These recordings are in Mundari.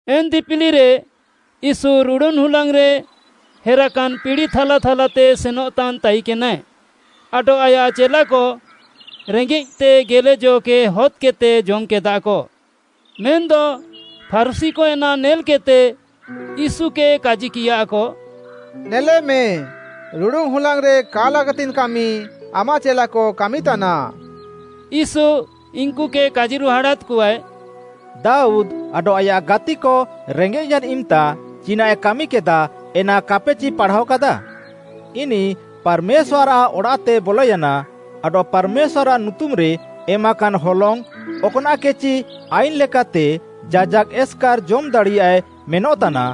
ଏନ୍‌ ଦିପିଲିରେ ୟୀଶୁ ରୁଡ଼ୁନ୍‌ ହୁଲାଙ୍ଗ୍‌ରେ ହେରାକାନ୍‌ ପିଡ଼ି ଥାଲାଥାଲାତେ ସେନଃତାନ୍‌ ତାଇକେନାଏ, ଆଡଃ ଆୟାଃ ଚେଲାକ ରେଙ୍ଗେଃତେ ଗେଲେ ଜ'କେ ହଦ୍‌କେଦ୍‌ତେ ଜମ୍‌କେଦାକ। ମେନ୍‌ଦ ଫାରୁଶୀକ ଏନା ନେଲ୍‌କେଦ୍‌ତେ, ୟୀଶୁକେ କାଜିକିୟାକ, “ନେଲେମେ, ରୁଡ଼ୁନ୍‌ ହୁଲାଙ୍ଗ୍‌ରେ କା ଲାଗାତିଙ୍ଗ୍‌ କାମି ଆମାଃ ଚେଲାକ କାମିତାନା।” ୟୀଶୁ ଇନ୍‌କୁକେ କାଜିରୁହାଡ଼ାଦ୍‌କଆଏ, “ଦାଉଦ୍‌ ଆଡଃ ଆୟାଃ ଗାତିକ ରେଙ୍ଗେଃୟାନ୍‌ ଇମ୍‌ତା ଚିନାଃଏ କାମିକେଦାଃ ଏନା କାପେଚି ପାଢ଼ାୱା କାଦାଃ? ଇନିଃ ପାର୍‌ମେଶ୍ୱାର୍‌ଆଃ ଅଡ଼ାଃତେ ବଲୟାନା, ଆଡଃ ପାର୍‌ମେଶ୍ୱାର୍‌ଆଃ ନୁତୁମ୍‌ରେ ଏମାକାନ୍‌ ହଲଙ୍ଗ୍‌, ଅକ୍‌ନାଃକେଚି ଆଇନ୍‌ ଲେକାତେ ଯାଜାକ୍‌ ଏସ୍‌କାର୍‌ ଜମ୍‌ ଦାଡ଼ିୟାଏ ମେନଃତାନା,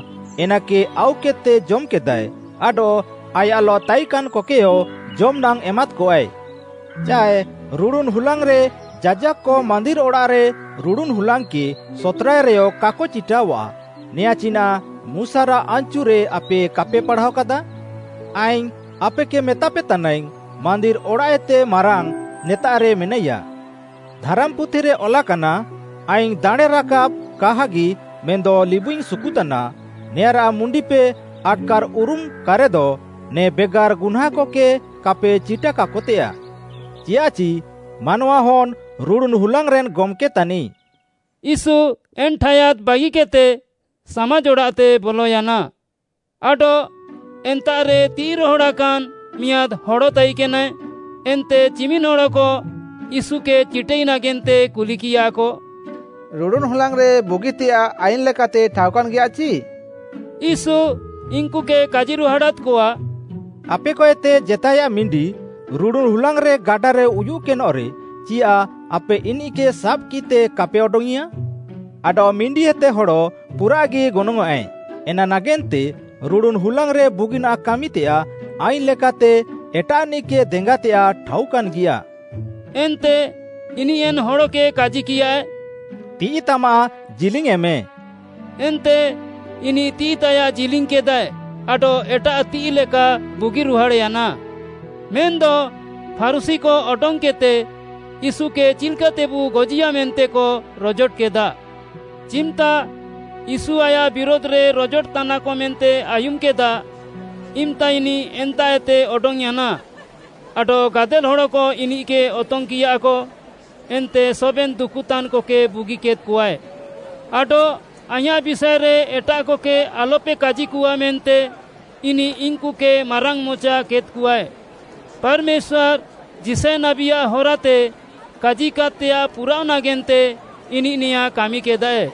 ଏନାକେ ଆଉକେଦ୍‌ତେ ଜମ୍‌କେଦାଏ ଆଡଃ ଆୟାଃଲଃ ତାଇକାନ୍‌କକେୟ ଜମ୍‌ନାଙ୍ଗ୍‌ ଏମାଦ୍‌କଆଏ। ଚାଏ ରୁଡ଼ୁନ୍‌ ହୁଲାଙ୍ଗ୍‌ରେ ଯାଜାକ୍‌କ ମାନ୍ଦିର୍‌ ଅଡ଼ାଃରେ ରୁଡ଼ୁନ୍‌ ହୁଲାଙ୍ଗ୍‌କେ ସତ୍‌ରାଏ ରେୟ କାକ ଚିଟାଅଃଆ, ନେଆଁ ଚିନାଃ ମୁଶାରାଃ ଆନ୍‌ଚୁରେ ଆପେ କାପେ ପାଢ଼ାଅକାଦା? ଆଇଙ୍ଗ୍‌ ଆପେକେ ମେତାପେ ତାନାଇଙ୍ଗ୍‌, ମାନ୍ଦିର୍‌ ଅଡ଼ାଃଏତେ ମାରାଙ୍ଗ୍‌ ନେତାଃରେ ମେନାଇୟା। ଧାରାମ୍‌ପୁଥିରେ ଅଲାକାନା, ‘ଆଇଙ୍ଗ୍‌ ଦାଣେଁରାକାବ୍‌ କାହାଗି ମେନ୍‌ଦ ଲିବୁଇଙ୍ଗ୍‌ ସୁକୁତାନା,’ ନେଆଁଁରାଃ ମୁଣ୍ଡିପେ ଆଟ୍‌କାର୍‌ଉରୁମ୍‌କାରେଦ, ନେ ବେଗାର୍‌ ଗୁହ୍ନାଁନ୍‌କକେ କାପେ ଚିଟାକାକତେୟାଃ। ଚିୟାଃଚି ମାନୱାହନ୍‌ ରୁଡ଼ୁନ୍‌ ହୁଲାଙ୍ଗ୍‌ରେନ୍ ଗମ୍‌କେ ତାନିଃ।” ୟୀଶୁ ଏନ୍‌ ଠାୟାଦ୍‌ ବାଗିକେଦ୍‌ତେ ସାମାଜ୍‌ ଅଡ଼ାଃତେ ବଲୟାନା। ଆଡଃ ଏନ୍ତାଃରେ ତିଃଇ ରହଡ଼ାକାନ୍‌ ମିଆଁଦ୍‌ ହଡ଼ ତାଇକେନାଏ। ଏନ୍ତେ ଚିମିନ୍‌ ହଡ଼କ ୟୀଶୁକେ ଚିଟାଇ ନାଗେନ୍ତେ କୁଲିକିୟାକ, “ରୁଡ଼ୁନ୍‌ ହୁଲାଙ୍ଗ୍‌ରେ ବୁଗିତେୟାଃ ଆଇନ୍‌ ଲେକାତେ ଠାଉକାନ୍‌ଗିୟାଚି?” ୟୀଶୁ ଇନ୍‌କୁକେ କାଜିରୁହାଡ଼ାଦ୍‌କଆ, “ଆପେକଏତେ ଜେତାଏୟାଃ ମିଣ୍ଡି, ରୁଡ଼ୁନ୍‌ ହୁଲାଙ୍ଗ୍‌ ଗାଡାରେ ଉୟୁଃକେନଃରେ, ଚିୟାଃ ଆପେ ଇନିଃକେ ସାବ୍‌କିତେ କାପେ ଅଡଙ୍ଗ୍‌ଇଁୟା? ଆଡଃ ମିଣ୍ଡିଏତେ ହଡ଼ ପୁରାଃଗି ଗନଙ୍ଗ୍‌ଆଁଏ। ଏନା ନାଗେନ୍ତେ ରୁଡ଼ୁନ୍‌ ହୁଲାଙ୍ଗ୍‌ରେ ବୁଗିନାଃ କାମିତେୟାଃ ଆଇନ୍‌ଲେକାତେ ଏଟାଃନିଃକେ ଦେଙ୍ଗାତେୟାଃ ଠାଉକାନ୍‌ଗିୟା।” ଏନ୍ତେ ଇନିଃ ଏନ୍‌ ହଡ଼କେ କାଜିକିୟାଏ, “ତିଃଇତାମାଃ ଜିଲିଙ୍ଗ୍‌ୟେଁମେ।” ଏନ୍ତେ ଇନିଃ ତିଃଇତାୟାଃ ଜିଲିଙ୍ଗ୍‌କେଦାଏ, ଆଡଃ ଏଟାଃ ତିଃଇ ଲେକା ବୁଗିରୁହାଡ଼୍‌ୟାନା। ମେନ୍‌ଦ ଫାରୁଶୀକ ଅଡଙ୍ଗ୍‌କେଦ୍‌ତେ ୟୀଶୁକେ ଚିଲ୍‌କାତେବୁ ଗଜିୟା ମେନ୍ତେକ ରଜୋଟକେଦା। ଚିମ୍‌ତା ୟୀଶୁ ଆୟାଃ ବିରୁଧ୍‌ରେ ରଜୋଟତାନାକ ମେନ୍ତେ ଆୟୁମ୍‌କେଦା ଇମ୍‌ତା ଇନିଃ ଏନ୍ତାଃଏତେ ଅଡଙ୍ଗ୍‌ୟାନା ଆଡଃ ଗାଦେଲ୍‌ ହଡ଼କ ଇନିଃକେ ଅତଙ୍ଗ୍‌କିୟାକ ଏନ୍ତେ ସବେନ୍‌ ଦୁକୁତାନ୍‌କକେ ବୁଗିକେଦ୍‌କଆଏ। ଆଡଃ ଆଇଁୟାଃ ବିଷାଏରେ ଏଟାଃକକେ ଆଲ୍‌ପେ କାଜିକଆ ମେନ୍ତେ ଇନିଃ ଇନ୍‌କୁକେ ମାରାଙ୍ଗ୍‌ମଚା କେଦ୍‌କଆଏ। ପାର୍‌ମେଶ୍ୱାର୍‌ ଯିଶାୟ ନାବୀଆଃ ହରାତେ କାଜିକାଦ୍‌ତେୟାଃ ପୁରାଅଃ, ନାଗେନ୍ତେ ଇନିଃ ନେଆଁଁ କାମିକେଦାଏ,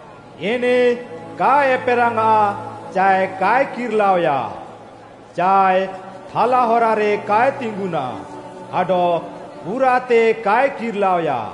ଇନିଃ କାଏ ଏପେରାଙ୍ଗ୍‌ଆଃ ଚାଏ କାଏ କିର୍‌ଲାଅୟା, ଚାଏ ଥାଲା ହରାରେ କାଏ ତିଙ୍ଗୁନା ଆଡଃ ପୁରାଃତେ କାଏ କିର୍‌ଲାଅୟା।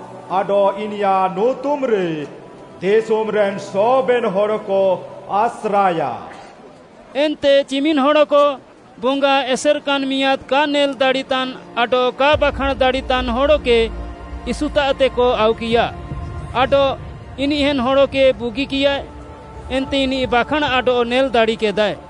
ଆଡଃ ଇନିୟାଃ ନୁତୁମ୍‌ରେ ଦିଶୁମ୍‌ରେନ୍‌ ସବେନ୍‌ ହଡ଼କ ଆସ୍ରାଏୟା।” ଏନ୍ତେ ଚିମିନ୍‌ ହଡ଼କ ବଙ୍ଗା ଏସେର୍‌କାନ୍‌ ମିଆଁଦ୍‌ କା ନେଲ୍‌ ଦାଡ଼ିତାନ୍‌ ଆଡଃ କା ବାଖାଁଣ୍‌ ଦାଡ଼ିତାନ୍‌ ହଡ଼କେ ୟୀଶୁତାଃତେକ ଆଉକିୟା, ଆଡଃ ଇନିଃ ଏନ୍‌ ହଡ଼କେ ବୁଗିକିୟାଏ, ଏନ୍ତେ ଇନିଃ ବାଖାଁଣ୍‌ ଆଡଃ ନେଲ୍‌ ଦାଡ଼ିକେଦାଏ।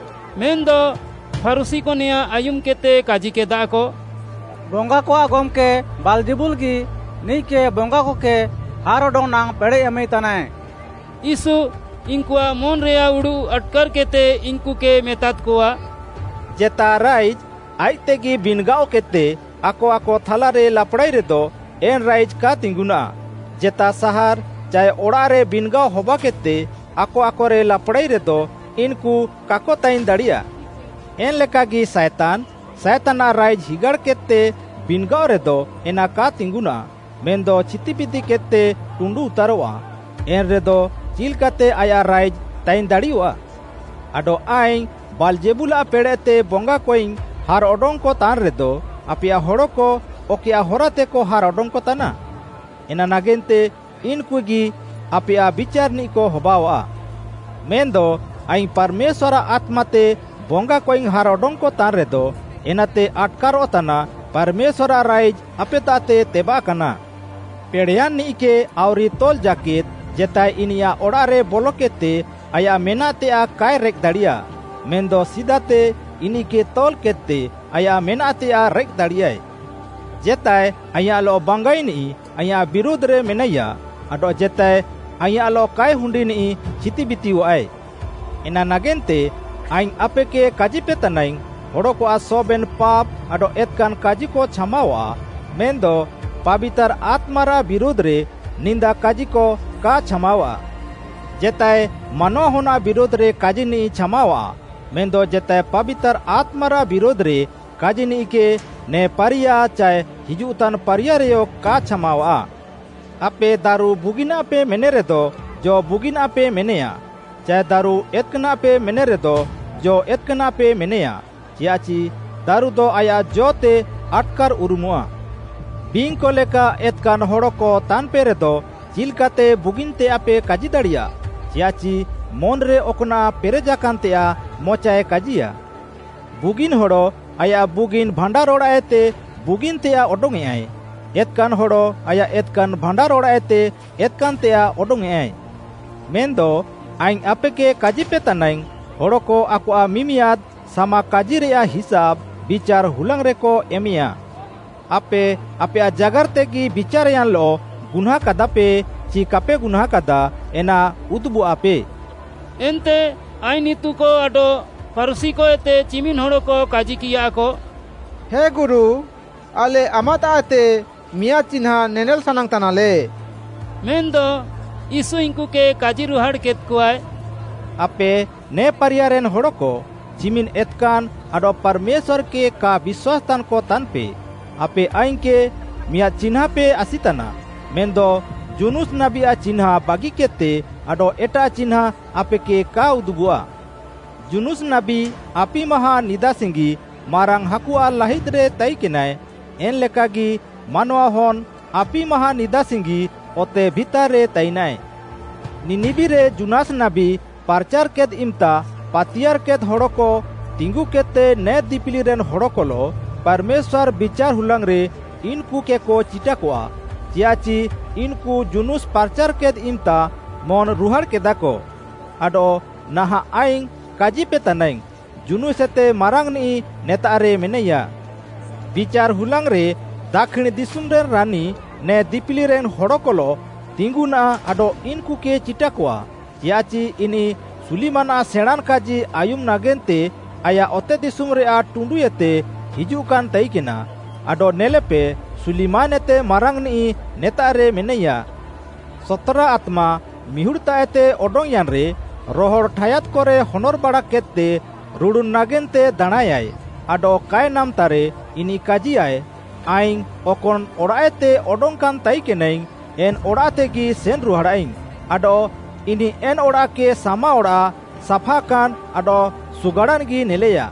ମେନ୍‌ଦ ଫାରୁଶୀକ ନେଆଁଁ ଆୟୁମ୍‌କେଦ୍‌ତେ କାଜିକେଦାକ, “ବଙ୍ଗାକଆଃ ଗମ୍‌କେ ବାଲ୍‌ଜେବୁଲ୍‌ଗି ନିଃକେ ବଙ୍ଗାକକେ ହାର୍‌ଅଡଙ୍ଗ୍‌ ନାଙ୍ଗ୍‌ ପେଡ଼େଃ ଏମାଇତାନାଏ।” ୟୀଶୁ ଇନ୍‌କୁଆଃ ମନ୍‌ରେୟାଃ ଉଡ଼ୁଃ ଆଟ୍‌କାର୍‌କେଦ୍‌ତେ ଇନ୍‌କୁକେ ମେତାଦ୍‌କଆ, “ଜେତା ରାଇଜ୍‌ ଆଇଃକ୍‌ତେଗି ବିନ୍‌ଗାଅକେଦ୍‌ତେ ଆକ ଆକଥାଲାରେ ଲାପ୍‌ଡ଼ାଇରେଦ ଏନ୍‌ ରାଇଜ୍‌ କା ତିଙ୍ଗୁନାଃ। ଜେତା ସାହାର୍‌ ଚାଏ ଅଡ଼ାଃରେ ବିନ୍‌ଗାଅ ହବାକେଦ୍‌ତେ ଆକ ଆକରେ ଲାପ୍‌ଡ଼ାଇରେଦ, ଇନ୍‌କୁ କାକ ତାଇନ୍‌ ଦାଡ଼ିୟା। ଏନ୍‌ଲେକାଗି ସାଏତାନ୍‌, ସାଏତାନ୍‌ଆଃ ରାଇଜ୍‌ ହିଗାଡ଼୍‌କେଦ୍‌ତେ ବିନ୍‌ଗାଅରେଦ ଏନା କା ତିଙ୍ଗୁନାଃ, ମେନ୍‌ଦ ଛିତିବିତିକେଦ୍‌ତେ ଟୁଣ୍ଡୁଉତାରଃଆ। ଏନ୍‌ରେଦ ଚିଲ୍‌କାତେ ଆୟାଃ ରାଇଜ୍‌ ତାଇନ୍‌ ଦାଡ଼ିୟଃଆ? ଆଡଃ ଆଇଙ୍ଗ୍‌ ବାଲ୍‌ଜେବୁଲ୍‌ଆଃ ପେଡ଼େଃତେ ବଙ୍ଗାକଇଙ୍ଗ୍‌ ହାର୍‌ଅଡଙ୍ଗ୍‌କ ତାନ୍‌ରେଦ, ଆପେୟାଃ ହଡ଼କ ଅକଏୟାଃ ହରାତେକ ହାର୍‌ ଅଡଙ୍ଗ୍‌କତାନା? ଏନା ନାଗେନ୍ତେ ଇନ୍‌କୁଗି ଆପେୟାଃ ବିଚାର୍‌ନିଃକ ହବାଅଆଃ। ମେନ୍‌ଦ ଆଇଙ୍ଗ୍‌ ପାର୍‌ମେଶ୍ୱାର୍‌ଆଃ ଆତ୍ମାତେ ବଙ୍ଗାକଇଙ୍ଗ୍‌ ହାର୍‌ଅଡଙ୍ଗ୍‌କ ତାନ୍‌ରେଦ ଏନାତେ ଆଟ୍‌କାରଃତାନା ପାର୍‌ମେଶ୍ୱାର୍‌ଆଃ ରାଇଜ୍‌ ଆପେତାଃତେ ତେବାଃକାନା। “ପେଡ଼େୟାନ୍‌ନିଃକେ ଆଉରି ତଲ୍‌ ଜାକେଦ୍‌ ଜେତାଏ ଇନିୟାଃ ଅଡ଼ାଃରେ ବଲକେଦ୍‌ତେ ଆୟାଃ ମେନାଃତେୟାଃ କାଏ ରେଃକ୍‌ଦାଡ଼ିୟା, ମେନ୍‌ଦ ସିଦାତେ ଇନିଃକେ ତଲ୍‌କେଦ୍‌ତେ ଆୟାଃ ମେନାଃତେୟାଃ ରେଃକ୍‌ଦାଡ଼ିୟାଏ। “ଜେତାଏ ଆଇଁୟାଃଲଃ ବାଙ୍ଗାଇନିଃ, ଆଇଁୟାଃ ବିରୁଧ୍‌ରେ ମେନାଇୟା ଆଡଃ ଜେତାଏ ଆଇଁୟାଃଲଃ କାଏ ହୁଣ୍ଡିନିଃ ଛିତିବିତିୟଃଆଏ। ଏନା ନାଗେନ୍ତେ, ଆଇଙ୍ଗ୍‌ ଆପେକେ କାଜିପେତାନାଇଙ୍ଗ୍‌, ହଡ଼କଆଃ ସବେନ୍‌ ପାପ୍‌ ଆଡଃ ଏତ୍‌କାନ୍‌ କାଜିକ ଛାମାୱାଃ, ମେନ୍‌ଦ ପାବିତାର୍‌ ଆତ୍ମାରାଃ ବିରୁଧ୍‌ରେ ନିନ୍ଦା କାଜିକ କା ଛାମାୱାଃ। ଜେତାଏ ମାନୱାହନ୍‌ଆଃ ବିରୁଧ୍‌ରେ କାଜିନିଃ ଛାମାୱାଃ, ମେନ୍‌ଦ ଜେତାଏ ପାବିତାର୍‌ ଆତ୍ମାରାଃ ବିରୁଧ୍‌ରେ କାଜିନିଃକେ ନେ ପାରିୟା ଚାଏ ହିଜୁଃତାନ୍‌ ପାରିୟାରେୟ କା ଛାମାୱାଃ। “ଆପେ ଦାରୁ ବୁଗିନାଃପେ ମେନେରେଦ ଜ ବୁଗିନାଃପେ ମେନେୟା ଚାଏ ଦାରୁ ଏତ୍‌କାନାଃପେ ମେନେରେଦ ଜ ଏତ୍‍କାନାଃପେ ମେନେୟା, ଚିୟାଃଚି ଦାରୁଦ ଆୟାଃ ଜ'ତେ ଆଟ୍‌କାର୍‍ଉରୁମଃଆ। ବିଙ୍ଗ୍‌କ ଲେକା ଏତ୍‍କାନ୍‌ ହଡ଼କ ତାନ୍‌ପେରେଦ ଚିଲ୍‌କାତେ ବୁଗିନ୍‌ତେୟାଃପେ କାଜିଦାଡ଼ିୟାଃ? ଚିୟାଃଚି ମନ୍‌ରେ ଅକ୍‌ନାଃ ପେରେଜାକାନ୍‌ତେୟାଃ ମଚାଏ କାଜିୟା। ବୁଗିନ୍‌ ହଡ଼ ଆୟାଃ ବୁଗିନ୍‌ ଭାଣ୍ଡାର୍‌ଅଡ଼ାଃଏତେ ବୁଗିନ୍‌ତେୟାଃ ଅଡଙ୍ଗ୍‌ୟେଁଆଏ, ଏତ୍‌କାନ୍‌ ହଡ଼ ଆୟାଃ ଏତ୍‌କାନ୍‌ ଭାଣ୍ଡାର୍‌ଅଡ଼ାଃଏତେ ଏତ୍‌କାନ୍‌ତେୟାଃ ଅଡଙ୍ଗ୍‌ୟେଁଆଏ। “ମେନ୍‌ଦ ଆଇଙ୍ଗ୍‌ ଆପେକେ କାଜିପେତାନାଇଙ୍ଗ୍‌, ହଡ଼କ ଆକଆଃ ମିମିଆଦ୍‌ ସାମାକାଜିରେୟାଃ ହିସାବ୍‌ ବିଚାର୍‌ ହୁଲାଙ୍ଗ୍‌ରେକ ଏମେୟା। ଆପେ ଆପେୟାଃ ଜାଗାର୍‌ତେଗି ବିଚାର୍‌ୟାନ୍‌ଲଃ ଗୁହ୍ନାଁଁକାଦାପେ ଚି କାପେ ଗୁହ୍ନାଁଁକାଦା, ଏନା ଉଦୁବଃଆପେ।” ଏନ୍ତେ ଆଇନ୍‌ ଇତୁକ ଆଡଃ ଫାରୁଶୀକଏତେ ଚିମିନ୍‌ ହଡ଼କ କାଜିକିୟାକ, “ହେ ଗୁରୁ, ଆଲେ ଆମାଃତାଃଏତେ ମିଆଁଦ୍‌ ଚିହ୍ନାଁ ନେନେଲ୍‌ ସାନାଙ୍ଗ୍‌ତାନାଲେ।” ମେନ୍‌ଦ ୟୀଶୁ ଇନ୍‌କୁକେ କାଜିରୁହାଡ଼୍‌କେଦ୍‌କଆଏ, “ଆପେ ନେ ପାରିୟାରେନ୍‌ ହଡ଼କ, ଚିମିନ୍‌ ଏତ୍‌କାନ୍‌ ଆଡଃ ପାର୍‌ମେଶ୍ୱାର୍‌କେ କା ବିଶ୍ୱାସ୍‌ତାନ୍‌କ ତାନ୍‌ପେ। ଆପେ ଆଇଙ୍ଗ୍‌କେ ମିଆଁଦ୍‌ ଚିହ୍ନାଁପେ ଆସିତାନା, ମେନ୍‌ଦ ଯୁନୁସ୍‌ ନାବୀଆଃ ଚିହ୍ନାଁ ବାଗିକେଦ୍‌ତେ ଆଡଃ ଏଟାଃ ଚିହ୍ନାଁ ଆପେକେ କା ଉଦୁବଃଆ। ଯୁନୁସ୍‌ ନାବୀ ଆପି ମାହାଁ ନିଦାସିଙ୍ଗି ମାରାଙ୍ଗ୍‌ ହାକୁଆଃ ଲାହିଦ୍‌ରେ ତାଇକେନାଏ, ଏନ୍‌ଲେକାଗି ମାନୱାହନ୍‌ ଆପି ମାହାଁ ନିଦାସିଙ୍ଗି ଅତେ ଭିତାର୍‌ରେ ତାଇନାଏ। ନିନିବିରେ ଯୁନୁସ୍‌ ନାବୀ ପ୍ରାଚାର୍‌କେଦ୍‌ ଇମ୍‌ତା ପାତିୟାର୍‌କେଦ୍‌ ହଡ଼କ ତିଙ୍ଗୁକେଦ୍‌ତେ ନେ ଦିପିଲିରେନ୍‌ ହଡ଼କଲଃ ପାର୍‌ମେଶ୍ୱାର୍‌ ବିଚାର୍‌ ହୁଲାଙ୍ଗ୍‌ରେ ଇନ୍‌କୁକେକ ଚିଟାକଆ, ଚିୟାଃଚି ଇନ୍‌କୁ ଯୁନୁସ୍‌ ପାର୍‌ଚାର୍‌କେଦ୍‌ ଇମ୍‌ତା ମନ୍‌ରୁହାଡ଼୍‌କେଦାକ, ଆଡଃ ନାହାଁଃ ଆଇଙ୍ଗ୍‌ କାଜିପେତାନାଇଙ୍ଗ୍‌, ଯୁନୁସ୍‌ଏତେ ମାରାଙ୍ଗ୍‌ନିଃ ନେତାଃରେ ମେନାଇୟା। ବିଚାର୍‌ ହୁଲାଙ୍ଗ୍‌ରେ ଦାକ୍ଷିଣ୍‌ ଦିଶୁମ୍‌ରେନ୍‌ ରାନୀ ନେ ଦିପିଲିରେନ୍‌ ହଡ଼କଲଃ ତିଙ୍ଗୁନାଃ ଆଡଃ ଇନ୍‌କୁକେ ଚିଟାକଆ, ଚିୟାଃଚି ଇନିଃ ସୁଲିମାନ୍‌ଆଃ ସେଣାଁଁନ୍‌ କାଜି ଆୟୁମ୍‌ ନାଗେନ୍ତେ ଆୟାଃ ଅତେଦିଶୁମ୍‌ରେୟାଃ ଟୁଣ୍ଡୁଏତେ ହିଜୁଃକାନ୍‌ ତାଇକେନା, ଆଡଃ ନେଲେପେ, ସୁଲିମାନ୍‌ଏତେ ମାରାଙ୍ଗ୍‌ନିଃ ନେତାଃରେ ମେନାଇୟା। “ସତ୍‌ରା ଆତ୍ମା ମିହୁଡ଼୍‌ତାଃଏତେ ଅଡଙ୍ଗ୍‌ୟାନ୍‌ରେ, ରହଡ଼୍‌ ଠାୟାଦ୍‌କରେ ହନର୍‌ବାଡ଼ାକେଦ୍‌ତେ ରୁଡ଼ୁନ୍‌ ନାଗେନ୍ତେ ଦାଣାଁଁୟାଏ ଆଡଃ କାଏ ନାମ୍‌ତାରେ, ଇନିଃ କାଜିୟାଏ, ‘ଆଇଙ୍ଗ୍‌ ଅକନ୍‌ ଅଡ଼ାଃଏତେ ଅଡଙ୍ଗ୍‌କାନ୍‌ ତାଇକେନାଇଙ୍ଗ୍‌, ଏନ୍‌ ଅଡ଼ାଃତେଗି ସେନ୍‌ରୁହାଡ଼ାଇଙ୍ଗ୍‌,’ ଆଡଃ ଇନିଃ ଏନ୍‌ ଅଡ଼ାଃକେ ସାମାଅଡ଼ାଃ, ସାଫାକାନ୍‌ ଆଡଃ ସୁଗାଡ଼ାନ୍‌ଗି ନେଲେୟା।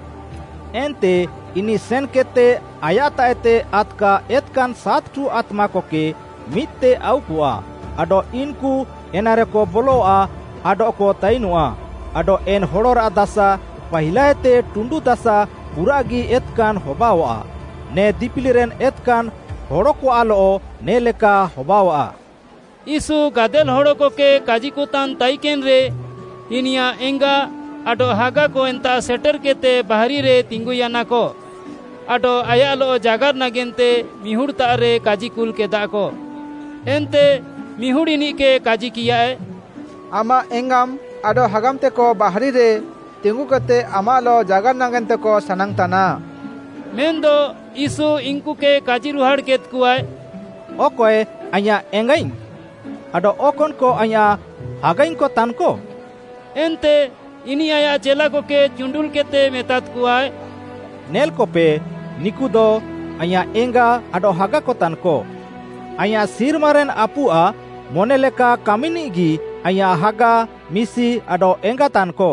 ଏନ୍ତେ ଇନିଃ ସେନ୍‌କେଦ୍‌ତେ ଆୟାଃତାଃଏତେ ଆଦ୍‌କା ଏତ୍‌କାନ୍‌ ସାତ୍‌ଠୁ ଆତ୍ମାକକେ ମିଦ୍‌ତେ ଆଉକଆ, ଆଡଃ ଇନ୍‌କୁ ଏନାରେକ ବଲଆ ଆଡଃକ ତାଇନଃଆ। ଆଡଃ ଏନ୍‌ ହଡ଼ରାଃ ଦାସା ପାହିଲାଏତେ ଟୁଣ୍ଡୁ ଦାସା ପୁରାଃଗି ଏତ୍‌କାନ୍‌ ହବାଅଆଃ। ନେ ଦିପିଲିରେନ୍‌ ଏତ୍‌କାନ୍‌ ହଡ଼କଆଃଲଃ ନେ ଲେକା ହବାଅଆଃ।” ୟୀଶୁ ଗାଦେଲ୍‌ ହଡ଼କକେ କାଜିକତାନ୍‌ ତାଇକେନ୍‌ରେ, ଇନିୟାଃ ଏଙ୍ଗା ଆଡଃ ହାଗାକ ଏନ୍ତାଃ ସେଟେର୍‌କେଦ୍‌ତେ ବାହାରିରେ ତିଙ୍ଗୁୟାନାକ ଆଡଃ ଆୟାଃଲଃ ଜାଗାର୍‌ ନାଗେନ୍ତେ ମିହୁଡ଼୍‌ତାଃରେ କାଜିକୁଲ୍‌କେଦାକ। ଏନ୍ତେ ମିହୁଡ଼୍‌ ଇନିଃକେ କାଜିକିୟାଏ, “ଆମାଃ ଏଙ୍ଗାମ୍‌, ଆଡଃ ହାଗାମ୍‌ତେକ ବାହାରିରେ ତିଙ୍ଗୁକେଦ୍‌ତେ ଆମାଃଲଃ ଜାଗାର୍‌ ନାଗେନ୍ତେକ ସାନାଙ୍ଗ୍‌ତାନା।” ମେନ୍‌ଦ ୟୀଶୁ ଇନ୍‌କୁ କାଜିରୁହାଡ଼୍‌କେଦ୍‌କଆଏ, “ଅକଏ ଆଇଁୟାଃ ଏଙ୍ଗାଇଙ୍ଗ୍‌? ଆଡଃ ଅକନ୍‌କ ଆଇଁୟାଃ ହାଗାଇଙ୍ଗ୍‌କ ତାନ୍‌କ?” ଏନ୍ତେ ଇନିଃ ଆୟାଃ ଚେଲାକକେ ଚୁଣ୍ଡୁଲ୍‌କେଦ୍‌ତେ ମେତାଦ୍‌କଆ, “ନେଲ୍‌କପେ, ନିକୁଦ, ଆଇଁୟାଃ ଏଙ୍ଗା ଆଡଃ ହାଗାକତାନ୍‌କ। ଆଇଁୟାଃ ସିର୍ମାରେନ୍‌ ଆପୁଆଃ ମନେଲେକା କାମିନିଃଗି ଆଇଁୟାଃ ହାଗା, ମିଶି ଆଡଃ ଏଙ୍ଗା ତାନ୍‌କ।”